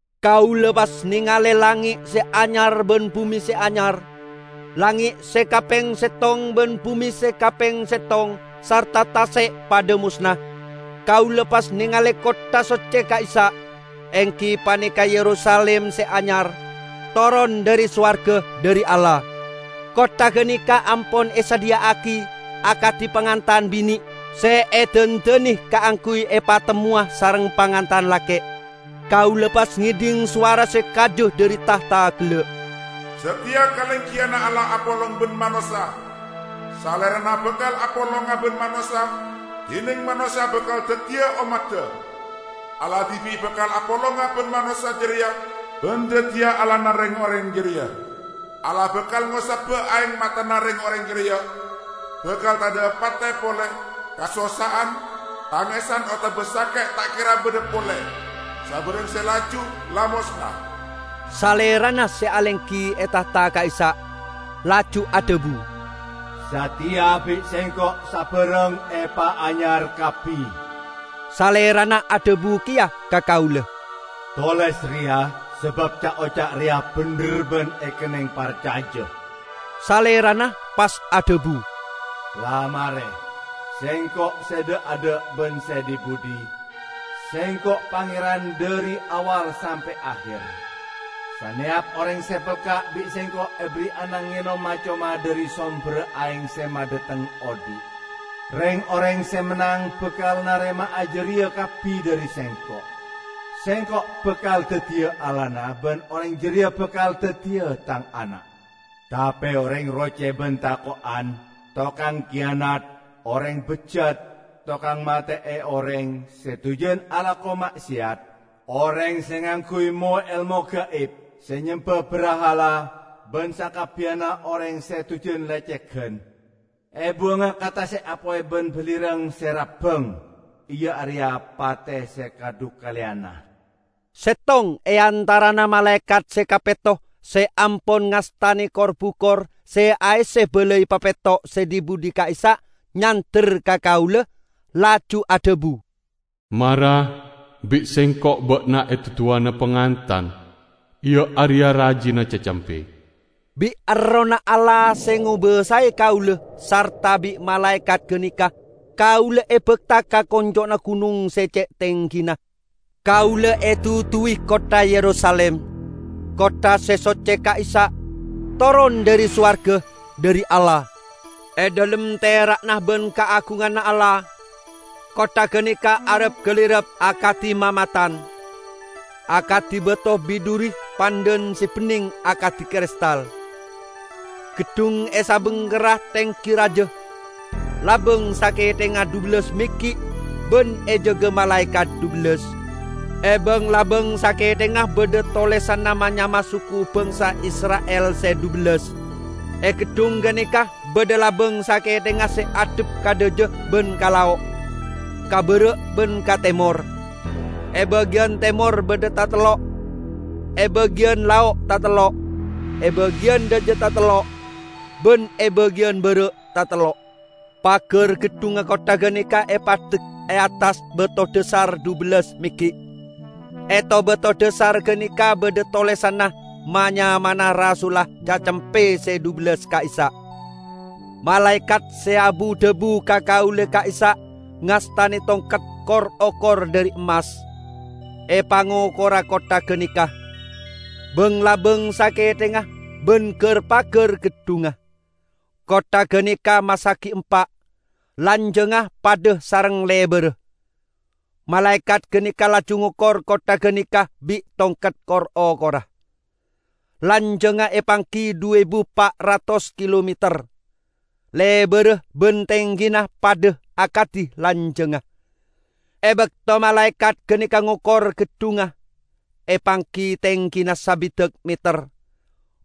Kaula pas nengale langnge' se anyar ban bume se anyar. Langnge' se kapeng settong ban bume se kapeng settong, sarta tase' padha mosna. Kaula pas nengale kottha socce ka'issa', enggi paneka Yerusalim se anyar, toron dhari sowarga dhari Allah. Kottha ganeka ampon esadhiya'agi akadi pangantan bine' se edandane kaangguy epatemmowa sareng pangantan lake'. Kaula pas ngedhing sowara se kaja dhari tahta gella', "Sateya kalenggiyanna Allah apolong ban manossa! Salerana bakal apolonga ban manossa, dineng manossa bakal daddiya ommadda. Allah dibi' bakal apolonga ban manossa jareya ban daddiya Allahna reng-oreng jareya. Allah bakal ngosaba aeng matana reng-oreng jareya. Bakal tadha'a pate pole; kasossa'an, tangesan otaba sake' ta' kera badha pole. Sabarang se laju la mosna." Salerana se alenggi e tahta ka'issa' laju adhabu, "Sateya bi' Sengko' sabarang epaanyar kabbi!" Salerana adhabu keya ka kaula, "Toles reya, sabab ca'-oca' reya bendher ban ekenneng parcaja." Salerana pas adhabu, "La mare! Sengko' se dha'-adha' ban se dhi-budhi; Sengko' Pangeran dhari awwal sampe' aher. Saneyap oreng se pelka' bi' Sengko' eberri'ana ngenom ma-coma dhari somberra aeng se madhateng odhi'. Reng-oreng se mennang bakal narema'a jareya kabbi dhari Sengko'. Sengko' bakal daddiya Allahna ban oreng jareya bakal daddiya Tang ana'. Tape oreng roce ban tako'an, tokang kiyanat, oreng bejjat, tokang mate'e oreng, se dujan alako ma'seyat, oreng se ngangguy mo-elmo gaib, se nyemba brahala, ban sakabbiyanna oreng se dujan lecegan, ebuwanga ka tase' apoy ban balirang se rabbang, iya areya pate se kadhukaleyanna." Settong e antarana malaekat se kapetto se ampon ngastane kor-bukor se aesse balai papetto' se dhi-budhi ka'issa' nyander ka kaula, laju adhabu, "Mara, bi' sengko' ba'na eduduwana Pangantan, iya areya rajina Cacempe." Bi' Errohna Allah se ngobasae kaula sarta bi' malaekat ganeka kaula ebakta ka konco'na gunong se ce' tenggina. Kaula eduduwi kottha Yerusalim, kottha se socce ka'issa', toron dhari sowarga, dhari Allah, e dhalem tera'na ban kaagunganna Allah. Kottha ganeka arap-galirap akadi mamatan, akadi bato bidhuri pandhan se benneng akadi kristal. Geddhung e sabingkerra tenggi raja, labang sakethengnga dhubellas meggi' ban ejaga malaekat dhubellas. E bang-labang sakethengnga badha tolesanna ma-nyamana suku bangsa Isra'il se dhubellas. E geddhung ganeka badha labang sakethengnga se addhep ka dhaja ban ka lao', ka bara' ban ka temor: e bagiyan temor badha tatello', e bagiyan lao' tatello', e bagiyan dhaja tatello' ban e bagiyan bara' tatello'. Pagar geddhungnga kottha ganeka epaddek e attas bato dhasar dhubellas meggi'. E to-bato dhasar ganeka badha tolesanna ma-nyamana rasulla Cacempe se dhubellas ka'issa'. Malaekat se abu-dhabu ka kaula ka'issa' ngastane tongket kor-okor dhari emmas, epangokora kottha ganeka, bang-labang sakethengnga ban gar-pagar geddhungnga. Kottha ganeka masagi empa' -- lanjangnga padha sareng lebarra. Malaekat ganeka laju ngokor kottha ganeka bi' tongket kor-okorra; lanjangnga epanggi dhu ebu pa' ratos kilometer, lebarra ban tenggina padha akadi lanjangnga. E bakto malaekat ganeka ngokor geddhungnga, epanggi tenggina sabidak meter.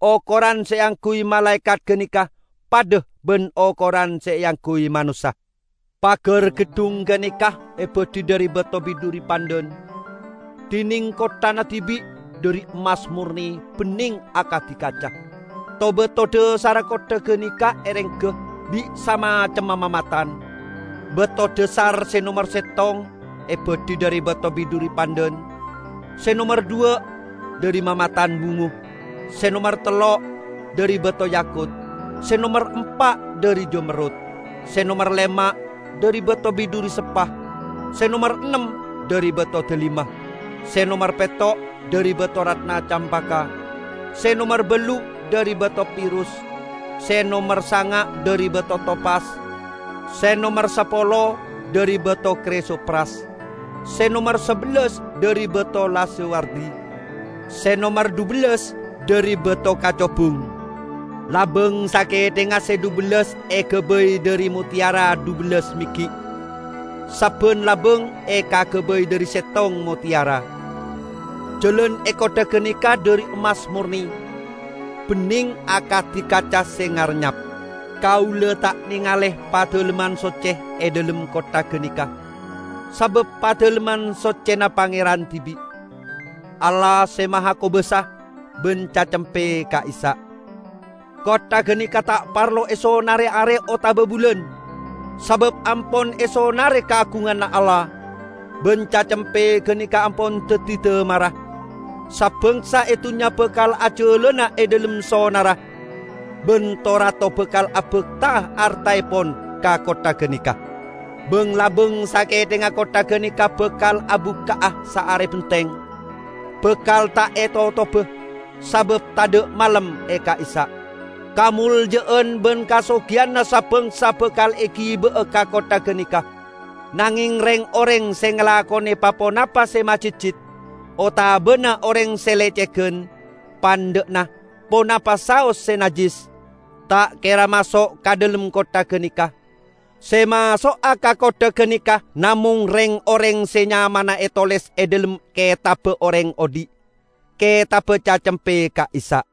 Okoran se eangguy malaekat ganeka padha ban okoran se eangguy manossa. Pagar geddhung ganeka ebadhi dhari bato bidhuri pandhan, dineng kotthana dibi' dhari emmas morne, benneng akadi kaca. To-bato dhasarra kottha ganeka erengga bi' samacemma mamatan. Bato dhasar se nomer settong ebadhi dhari bato bidhuri pandhan, se nomer dhuwa' dhari mamatan bungo, se nomer tello' dhari bato yakut, se nomer empa' dhari jamerrut, se nomer lema' dhari bato bidhuri sepah, se nomer ennem dhari bato dalima, se nomer petto' dhari bato ratna campaka, se nomer ballu' dhari bato pirus, se nomer sanga' dhari bato topas, se nomer sapolo dhari bato krisopras, se nomer sabellas dhari bato lazuwardi, se nomer dhubellas dhari bato kacobung. Labang sakethengnga se dhubellas egabay dhari motteyara dhubellas meggi', sabban labang ekagabay dhari settong motteyara. Jalan e kottha ganeka dhari emmas morne, benneng akadi kaca se ngarennyap. Kaula ta' nengale Padalemman Socce e dhalem kottha ganeka, sabab Padalemman Soccena Pangeran dibi', Allah Se Mahakobasa, ban Cacempe ka'issa'. Kottha ganeka ta' parlo esonare are otaba bulan, sabab ampon esonare kaagunganna Allah, ban Cacempe ganeka ampon daddi damarra. Sa-bangsa e dunnya bakal ajalana e dhalem sonarra, ban to-rato bakal abakta'a artaepon ka kottha ganeka. Bang-labang sakethengnga kottha ganeka bakal abukka'a saare benteng, bakal ta' etotoba, sabab tadha' malem e ka'issa'. Kamolja'an ban kasogiyanna sa-bangsa bakal egiba'a ka kottha ganeka. Nangeng reng-oreng se ngalakone pa-ponapa se majitjit, otabana oreng se lecegan -- pandha'na ponapa saos se najjis, ta' kera maso' ka dhalem kottha ganeka. Se maso'a ka kottha ganeka namong reng-oreng se nyamana etoles e dhalem Ketabba Oreng Odhi', ketabba Cacempe ka'issa'.